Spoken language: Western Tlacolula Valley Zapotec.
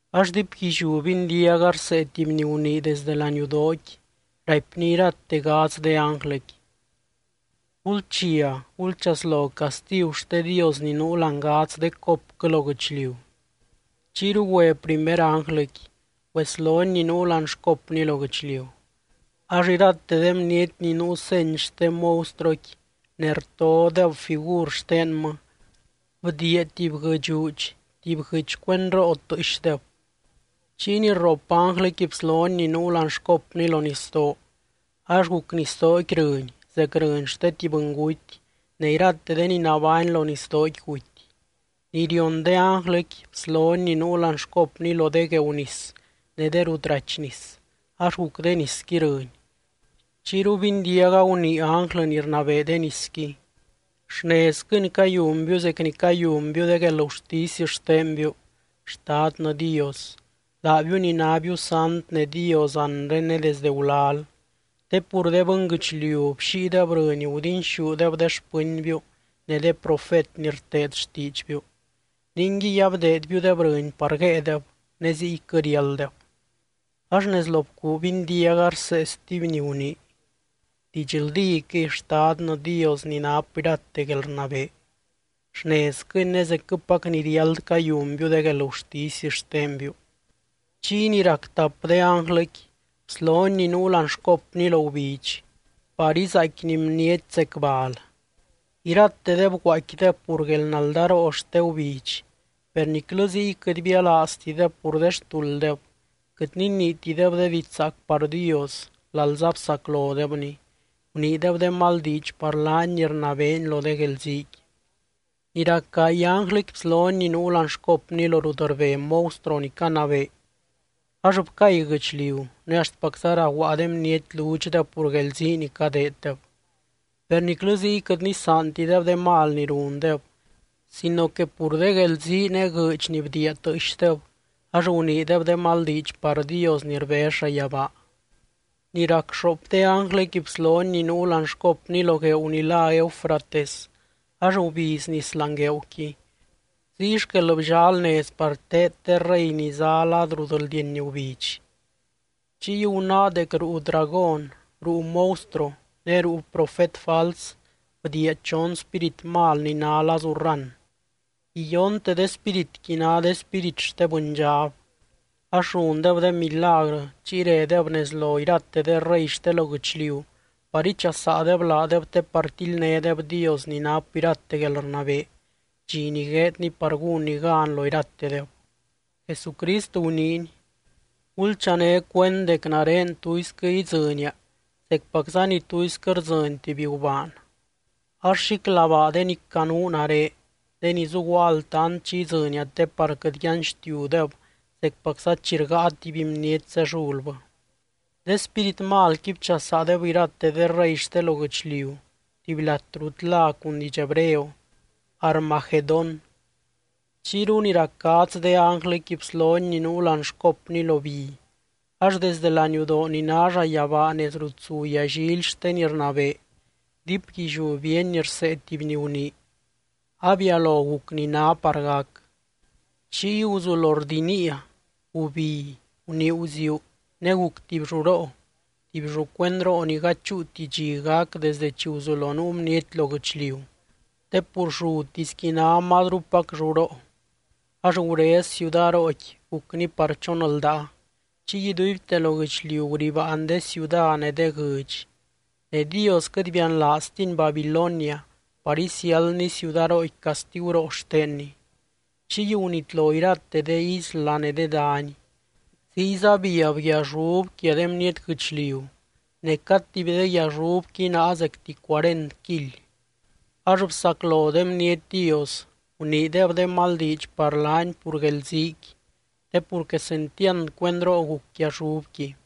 Ax diipguilliú bindiaga rsee tuby ni gunii desdɨ laniudooqui, raipny irate gadz de ánglɨqui: —Gulchia, gulchaslo castigu xte Dios ni nuu láani gadz de copquɨ lo guɨchliu. Chiyru güe primer ánglɨqui, güeslony ni nuu láani xcopny lo guɨchliu. Ax irate de bniety ni nuu seny xte monstruoqui ne rtodeb figur xtenmɨ, bdiia tuby guɨdxuudx, tuby guɨɨdx cuendroo tɨɨxdeb. Chiy ni rrop ánglɨqui bslony ni nuu láani xcopny lo nisdoo. Ax guc nisdooqui rɨny zec rɨny xte tuby bɨnguty, ne irate de ni nabány lo nisdooqui guty. Ni rion de ánglɨqui bslony ni nuu láani xcopny lo de gueeu nis ne de rut rachy nis ax guc de nisqui rɨny. Chiyru bindiaga gunii ánglɨ ni rnabee de nisqui: —Xnezquɨni cayunbiu zec ni cayunbiu de guelgurtisy xtenbiu, Xtadnɨ Dios, laabiu ni nábiu sant ne Dios anre ne desde gulal. Te pur de bɨnguɨchliu bxíideb rɨny gudinxúdeb de xpɨnbiu ne de profet ni rteed xtiidxbiu. Ninguiy abdeedbiudeb rɨny par guéedeb, ne ziyquɨ riálddeb. Ax nez lo bcuu bindiaga rsee stuby ni gunii: —Didxldíquɨy, Xtadnɨ Dios ni nap irate guelrnabee. Xnezquɨni ne zecquɨpac ni riáld cayunbiu de guelgurtisy xtenbiu. Chiy ni rac tap de ánglɨqui bslony ni nuu láani xcopny lo gubidx par izaaicquini bniety zec bal. Iratedeb guaaicquideb pur guelnaldaroo xte gubidx. Per niclɨ ziy quɨt bialaaztideb pur de xtulddeb, quɨt niniitideb de diidx zaac par Dios, lalza bsaclodebny, guniideb de mal diidx par laany ni rnabeeny lo de guelziiqui. Ni rac gaay ánglɨqui bslony ni nuu láani xcopny lo rut rbe monstruo ni canabee, ax bcay guɨchliu ne axtpacza raguaa de bniety ludxdeb pur guelzii ni cadeeddeb. Per niclɨ ziy quɨt nisaantideb de mal ni rundeb, sino que pur de guelzii ne guɨɨdx ni bdiia tɨɨxdeb, ax guniideb de mal diidx par Dios ni rbez llayabaa. Ni rac xoop de ánglɨqui bslony ni nuu láani xcopny lo gueeu ni lá Eufrates ax gubiz nis láani gueeuqui. Ziy xquel bllal nez par teed de rey ni zá lad rut rldieny gubidx. Chiy gunáa dec ruu dragón, ruu monstruo ne ruu profet fals bdiia chon spírit mal ni ná lazu rran. Iyonte de spíritqui ná de spírit xte bɨndxab, ax rundeb de milagrɨ, chiy redeb nez lo irate de rey xte lo guɨchliu par ichasaadeb laadeb te par tildnédeb Dios ni nap irate guelrnabee, dxi ni gueedny par gúnny gan lo iratedeb. Jesucrist guniiny: —Gulchané cuend dec nare tuisquɨ idzɨnia zecpacza ni tuisquɨ rdzɨny tuby gubaan. Ax xíclabaa de ni canuu nare, de ni zuguaa altant chi idzɨnia te par quɨt yanxtiudeb zecpacza chi rgáa tuby bniety zellulbɨ. De spírit malqui bchasaadeb irate de rey xte lo guɨchliu tuby lat rut lá cun diidx hebreo, Armagedón. Chiyru ni rac gadz de ánglɨqui bslony ni nuu láani xcopny lo bi, ax desde laniudoo ni ná llayabaa nez rut zu yallily xte ni rnabee, diipguilliú bíeny rsee tuby ni gunii: —Abialo guc ni ná par gac. Chiy guzulo rdiniia, gubi, gunii guziuu ne guc tuby lluroo, tuby llu cuendroo ni gady chúuti dxi gac desdɨ chi guzulo nuu bniety lo guɨchliu, te pur llutisqui ná mazrupac lluroo. Ax gurez ciudarooqui gucni par chon ldaa, chiy iduibte lo guɨchliu guribaan de ciuda ne de guɨdx. Ne Dios quɨt bianlaaztiny Babilonia par isiáldny ciudarooqui castiguroo xtenny. Chiy gunitlo irate de isla ne de dany. Ziyza biab guiallub quia de bniety guɨchliu, ne cad tuby de guiallubqui náa zecti cuarent kily. Ax bsaclo de bniety Dios, guniideb de mal diidx par laany pur guelziiqui, te pur quesentiand cuendroo guc guiallubqui.